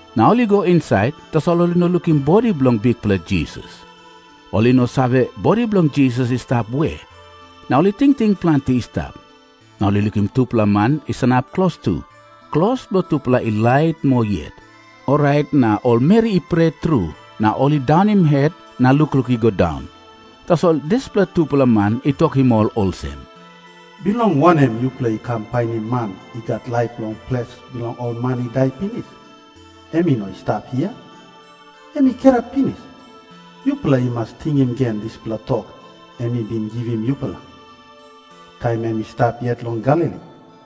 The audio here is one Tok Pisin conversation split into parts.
Na ol i go insait, tasol ol i no lukim bodi bilong Bikpela Jisas. Ol i no save bodi bilong Jisas i stap we, na ol i tingting planti i stap. Na ol i lukim tupela man i sanap klostu, klos bilong tupela i lait moa yet. Orait na ol meri i pret tru na ol i daunim het na lukluk i go daun. Tasol dispela tupela man i tokim ol olsem, “Bilong wanem yupela i kam painim man i gat laip long ples bilong ol man i dai pinis? Em i no i stap hia. Em i kirap pinis. Yupela i mas tingim gen dispela tok em i bin givim yupela, taim em i stap yet long Galili.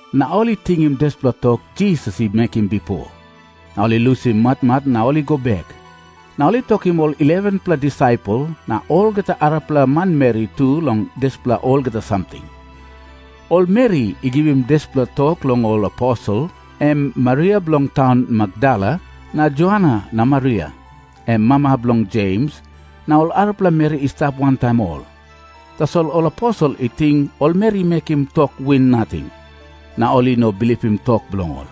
Na ol i tingim dispela tok Jisas i mekim bipo, na ol i lusim matmat na ol i go bek. Na ol i tokim ol 11-pela disaipel na olgeta arapela manmeri tu long dispela olgeta samting. Ol meri i givim dispela tok long ol aposel, em Maria bilong taun Makdala na Joana na Maria, em mama bilong Jems, na ol arapela meri i stap wantaim ol. Tasol ol aposel i ting ol meri i mekim tok win nating. Na ol i no bilipim tok bilong ol.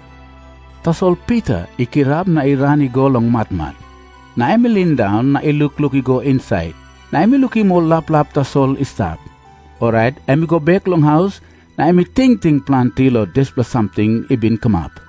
Tasol Pita i kirap na i ran i go long matmat. Na em i lindaun na i lukluk i go insait, na em i lukim ol laplap tasol i stap. Orait em i go bek long haus na em i tingting planti long dispela samting i bin kamap.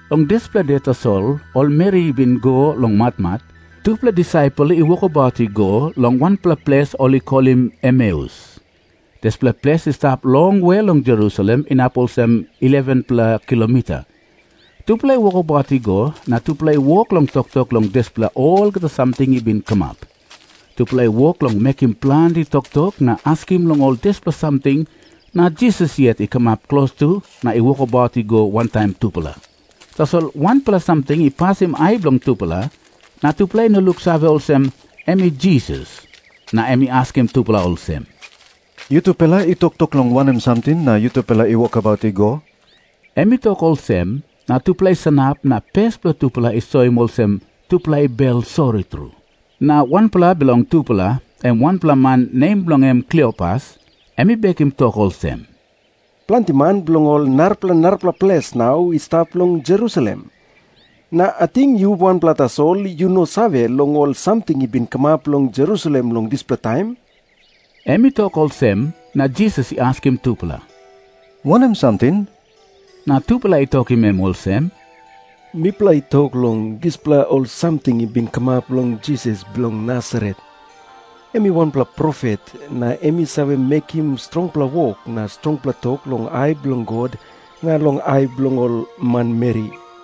Long dispela de tasol ol meri i bin i go long matmat, tupela disaipel i wokabaut i go long wanpela ples ol i kolim Emeus. Dispela ples i stap longwe long Jerusalem inap olsem 11-pela kilomita. Tupela i wokabaut i go, na tupela i wok long toktok long dispela olgeta samting i bin kamap. Tupela i wok long mekim planti toktok na askim long ol dispela samting, na Jisas yet i kamap klostu na i wokabaut i go wantaim tupela. Tasol wanpela samting i pasim ai bilong tupela, na tupela i no luksave olsem, em i Jisas. Na em i askim tupela olsem, “Yutupela i toktok long wanem samting na yutupela i wokabaut i go?” Em i tok olsem, na tupela i sanap na pes bilong tupela i soim olsem tupela i bel sori tru. Na wanpela bilong tupela, em wanpela man nem bilong en Kliopas, em i bekim tok olsem, “Planti man bilong ol narapela narapela ples nau ol i stap long Jerusalem. Na ating yu wanpela tasol yu no save long ol samting i bin kamap long Jerusalem long dispela taim?” Em i tok olsem, na Jisas i askim tupela, “Wanem samting?” Na tupela i tokim em olsem, “Mipela i tok long dispela ol samting i bin kamap long Jisas bilong Nasaret. Em i wanpela profet, na em i save mekim strongpela wok na strongpela tok long ai bilong God na long ai bilong ol manmeri.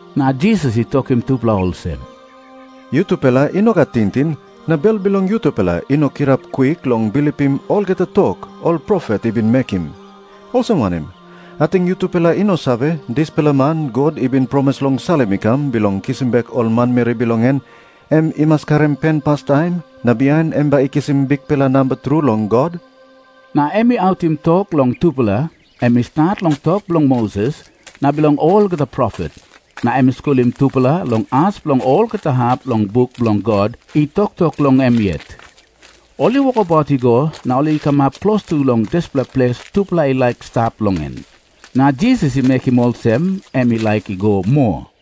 Na Jisas i tokim tupela olsem, “Yutupela i no gat tingting na bel bilong yutupela i no kirap kwik long bilipim olgeta tok ol profet i bin mekim. Olsem wanem? Ating yutupela i no save, dispela man God i bin promis long salim i kam bilong kisim bek ol manmeri bilong en, em i mas karim pen pastaim na bihain em bai i kisim bikpela namba tru long God?” Na em i autim tok long tupela. Em i stat long tok bilong Moses na bilong olgeta profet, na em i skulim tupela long as bilong olgeta hap bilong buk bilong God i toktok long em yet. Ol i wokabaut i go na ol i kamap klostu long dispela ples tupela i laik i stap long en. Na Jisas i mekim olsem em i laik i go moa.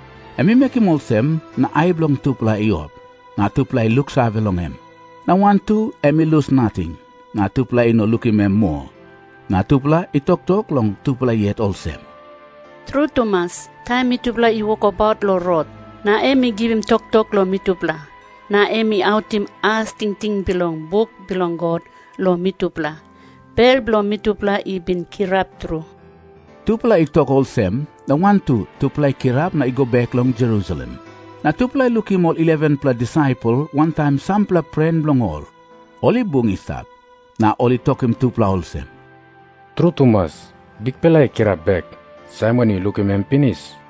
Em i mekim olsem, na ai bilong tupela i op, na tupela i luksave long em. Na wantu em i lus nating, na tupela i no lukim em moa. Na tupela i toktok long tupela yet olsem, “Tru tumas, taim mitupela i wokabaut long rot, na em i givim toktok long mitupela, na em i autim as tingting bilong buk bilong God long mitupela, bel bilong mitupela i bin kirap tru.” Tupela i tok olsem, na wantu tupela i kirap na i go bek long Jerusalem. Na tupela i lukim ol 11-pela disaipel wantaim sampela pren bilong ol, ol i bung i stap. Na ol i tokim tupela olsem, “Tru tumas, Bikpela i kirap bek! Saimon i lukim em pinis!”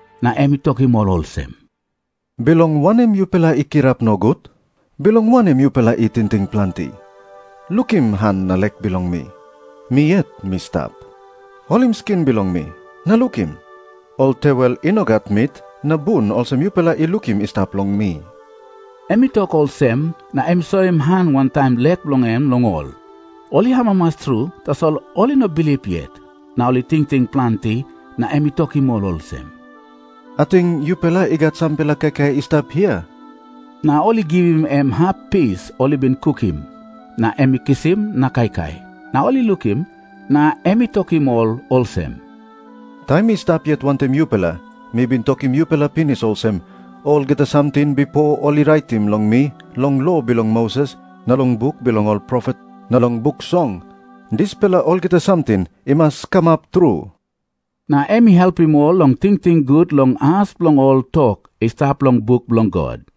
Na em i tokim ol olsem, “Bilong wanem yupela i kirap nogut? Bilong wanem yupela i tingting planti? Lukim han na lek bilong mi. Mi yet mi stap. Holim skin bilong mi, na lukim. Ol tewel i no gat mit na bun olsem yupela i lukim i stap long mi.” Em i tok olsem, na em i soim han wantaim lek bilong en long ol. Ol i amamas tru, tasol ol i no bilip yet. Na ol i tingting planti. Na em i tokim ol olsem, “Ating yupela i gat sampela kaikai i stap hia?” Na ol i givim em hap pis ol i bin kukim, na em i kisim na kaikai, na ol i lukim. Na em i tokim ol olsem, “Taim mi stap yet wantaim yupela, mi bin tokim yupela pinis olsem, olgeta samting bipo ol i raitim long mi long lo bilong Moses na long buk bilong ol profet na long Buk Song, dispela olgeta samting i mas kamap tru.” Na em i helpim ol long tingting gut long as bilong ol tok i stap long buk bilong God.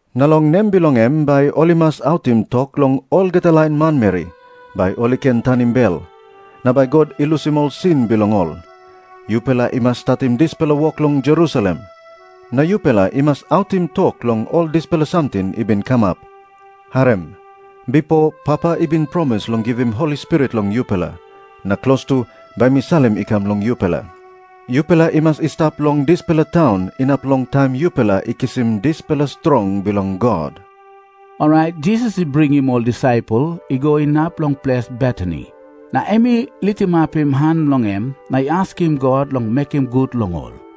Na long nem bilong em bai ol i mas autim tok long olgeta lain manmeri, bai ol i ken tanim bel, na bai God i lusim ol sin bilong ol. Yupela i mas statim dispela wok long Jerusalem, na yupela i mas autim tok long ol dispela samting i bin kamap. Harim. Bipo Papa i bin promis long givim Holi Spirit long yupela, na klostu bai mi salim i kam long yupela. Yupela i mas i stap long dispela taun inap long taim yupela i kisim dispela strong bilong God.” Orait Jisas i bringim ol disaipel i go inap long ples Betani. Na em i litimapim han bilong en na i askim God long mekim gut long ol.